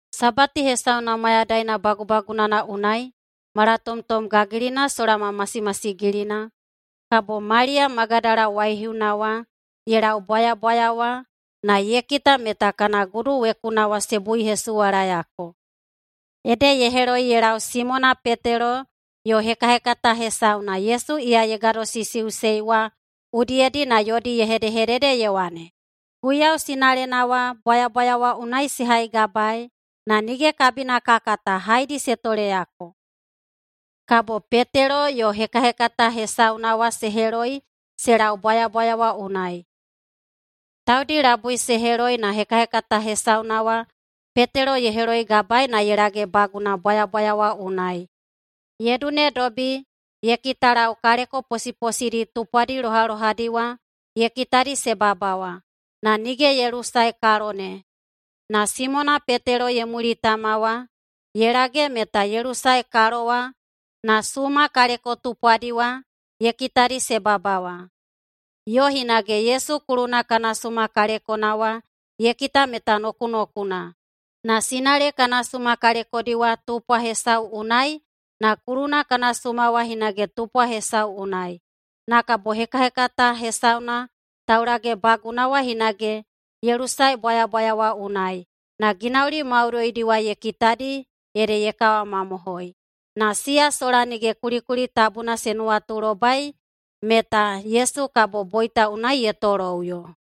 Sabati hesauna mayadaina bagubagunana unai, malatomtom gagilina sola ma masimasigilina, kabo Maliya Magadala waihiuna wa ye lau bwayabwaya wa na ye kita meta kana gudu wekuna wa se buihesuwalayako. Ede ye heloi ye lau Simona Petelo yo hekahekata hesauna Yesu iya ye gadosisiꞌusei wa udiyedi na yodi ye hedehedede ye wane, “Guiyau sinalena wa bwayabwaya wa unai se haigabaei na nige kabina ka kata haedi se toleyako!” Kabo Petelo yo hekahekata hesauna wa se heloi se lau bwayabwaya wa unai. Taudi labui se heloi na hekahekata hesauna wa Petelo ye heloigabaei na ye lagebaguna bwayabwaya wa unai. Ye dunedobi ye kitalau kaleko posiposidi tupwadi lohalohadi wa ye kitadi se bawabawa, na nige ye lusae kalo ne. Na Simona Petelo ye mulitama wa ye lage meta ye lusae kalo wa na suma kaleko tupwadi wa ye kitadi se bawabawa, yo hinage Yesu kuluna kana suma kalekona wa ye kita meta nokunokuna, na sinale kana suma kalekodi wa tupwa hesau unai na kuluna kana suma wa hinage tupwa hesau unai. Na kabo hekahekata hesauna taulagebaguna wa hinage ye lusae bwayabwaya wa unai. Na ginauli maudoidi wa ye kitadi ede ye kawamamohoi. Na siya sola nige kulikuli tabuna se nuwatulobai meta Yesu kabo boita unai ye toloꞌuyo.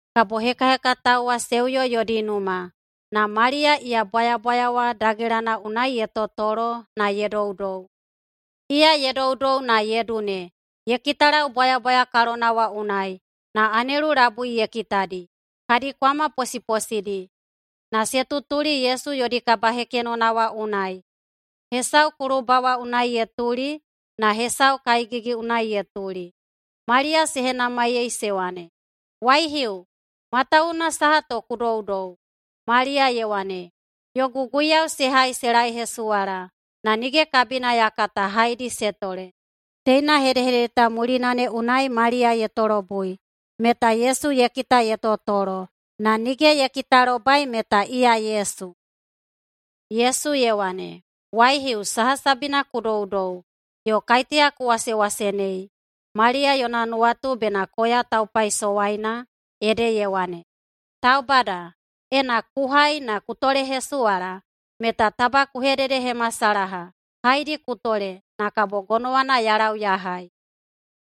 Kabo hekahekatao wa se uyo yodi numa. Na Maliya iya bwayabwaya wa dagelana unai ye totolo na ye doudou. Iya ye doudou na ye dune ye kitalau bwayabwaya kalona wa unai, na anelu labui ye kitadi. Kadi kwama posiposidi, na se tutuli Yesu yodi kabahekenona wa unai, hesau kulubawa unai ye tuli na hesau kaegigi unai ye tuli. Maliya se henamaiyei se wane, “Waihiu, matawuwuna saha to ku doudou?” Maliya ye wane, “Yogu guiyau se hai se laehesuwala, na nige kabina ya kata haedi se tole.” Teina hedehedede ta mulina ne unai Maliya ye tolobui, meta Yesu ye kita ye totolo, na nige ye kitalobai meta iya Yesu. Yesu ye wane, “Waihiu, saha sabina ku doudou? Yo kaiteya ku wasewasenei?” Maliya yona nuwatu bena koya taupaisowaina, ede ye wane, “Taubada, ena ku hai na ku tolehesuwala meta taba ku hededehemasalaha haedi ku tole, na kabo gonowana ya lau ya hai.”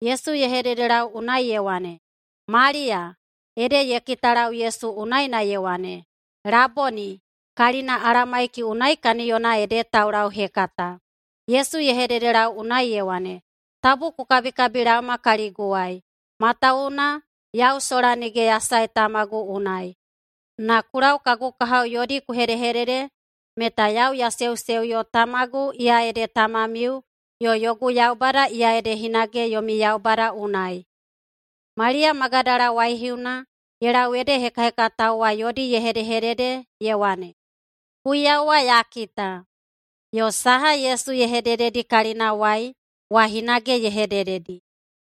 Yesu ye hededelau unai ye wane, “Maliya.” Ede ye kitalau Yesu unai na ye wane, “Laboni!” Kalina Alamaiki unai kaniyona ede taulauhekata. Yesu ye hededelau unai ye wane, “Tabu ku kabikabilaoma kaliguwai, matawuwuna yau sola nige ya sae tamagu unai. Na ku lau kagu kahao yodi ku hedehedede meta yau ya seuseuyo Tamagu iya ede Tamamiu, yo yogu Yaubada iya ede hinage yomi Yaubada unai.” Maliya Magadala waihiuna ye lau ede hekahekatao wa yodi ye hedehedede ye wane, “Guiyau wa ya kita!” Yo saha Yesu ye hedededi kalinawai wa hinage ye hedededi.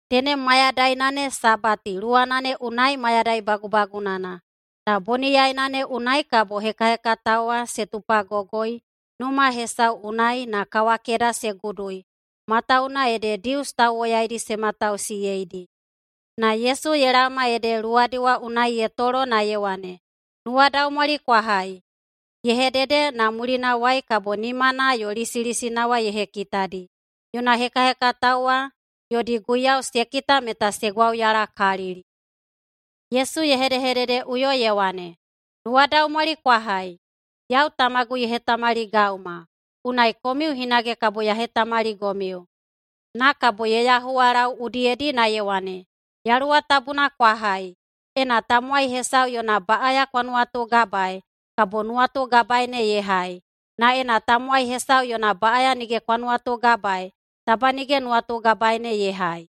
Tenem mayadaina ne sabati luwana ne unai mayadai bagubagunana, na boniyaina ne unai kabo hekahekatao wa se tupagogoi numa hesau unai na kawakeda se gudui, matawuwuna ede Dius tauwoyaidi se matausiyeidi. Na Yesu ye laoma ede luwadi wa unai ye tolo na ye wane, “Nuwadaumwali kwa hai!” Ye hedede, na mulinawai kabo nimana yo lisilisina wa ye hekitadi. Yona hekahekatao wa yodi Guiyau se kita meta se gwauyalakalili. Yesu ye hedehededeꞌuyo ye wane, “Nuwadaumwali kwa hai! Yau Tamagu ye hetamaligauma, unai komiu hinage kabo ya hetamaligomiu.” Na kabo ye yahuwalau udiyedi na ye wane, “Yaluwa Tabuna kwa hai. Ena tamowai hesau yona baꞌaya kwa nuwatugabaei, kabo nuwatugabae ne ye hai, na ena tamowai hesau yona baꞌaya nige kwa nuwatugabaei, taba nige nuwatugabae ne ye hai.”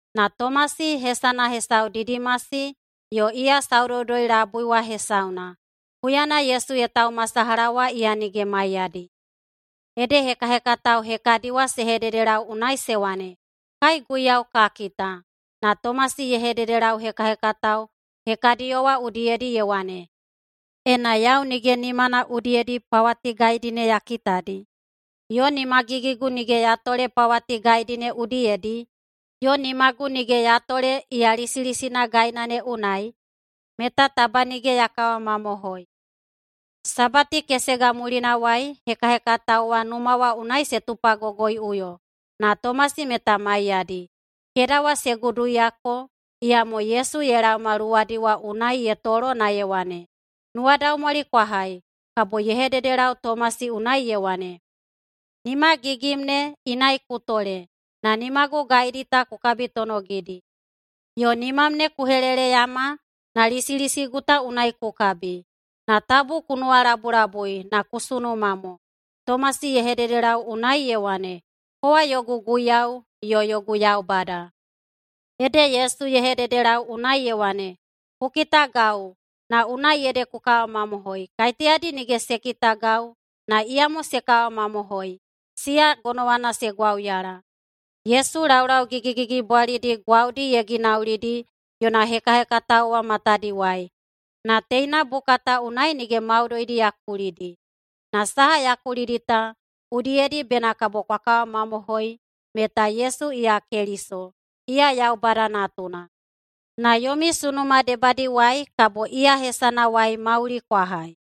Na Tomasi, hesana hesau Didimasi yo iya saudoudoi labui wa hesauna, huyana Yesu ye taumasalaha wa iya nige maiyadi. Ede hekahekatao hekadi wa se hededelau unai se wane, “Kai Guiyau ka kita!” Na Tomasi ye hededelau hekahekatao hekadiyo wa udiyedi ye wane, “Ena yau nige nimana udiyedi pawati gaidi ne ya kitadi, yo nimagigigu nige ya tole pawati gaidi ne udiyedi, yo nimagu nige ya tole iya lisilisina gaina ne unai, meta taba nige ya kawamamohoi.” Sabati kesega mulinawai, hekahekatao wa numa wa unai se tupagogoiꞌuyo na Tomasi meta maiyadi. Keda wa se guduyako, iyamo Yesu ye laoma luwadi wa unai ye tolo na ye wane, “Nuwadaumwali kwa hai!” Kabo ye hededelau Tomasi unai ye wane, “Nimagigim ne inai ku tole na nimagu gaidi ta ku kabitonogidi. Yo nimam ne ku heleleyama na lisilisigu ta unai ku kabi. Na tabu ku nuwalabulabui na ku sunuma mo.” Tomasi ye hededelau unai ye wane, “Kowa yogu Guiyau yo yogu Yaubada.” Ede Yesu ye hededelau unai ye wane, “Ku kitagau, na unai ede ku kawamamohoi. Kaiteyadi nige se kitagau na iyamo se kawamamohoi, siya gonowana se gwauyala.” Yesu laulau gigigigibwalidi gwaudi ye ginaulidi yona hekahekatao wa matadiwai, na teina buka ta unai nige maudoidi ya kulidi. Na saha ya kulidi ta, udiyedi bena kabo kwa kawamamohoi meta Yesu iya Keliso, iya Yaubada Natuna. Na yomi sunuma debadiwai kabo iya hesanawai mauli kwa hai.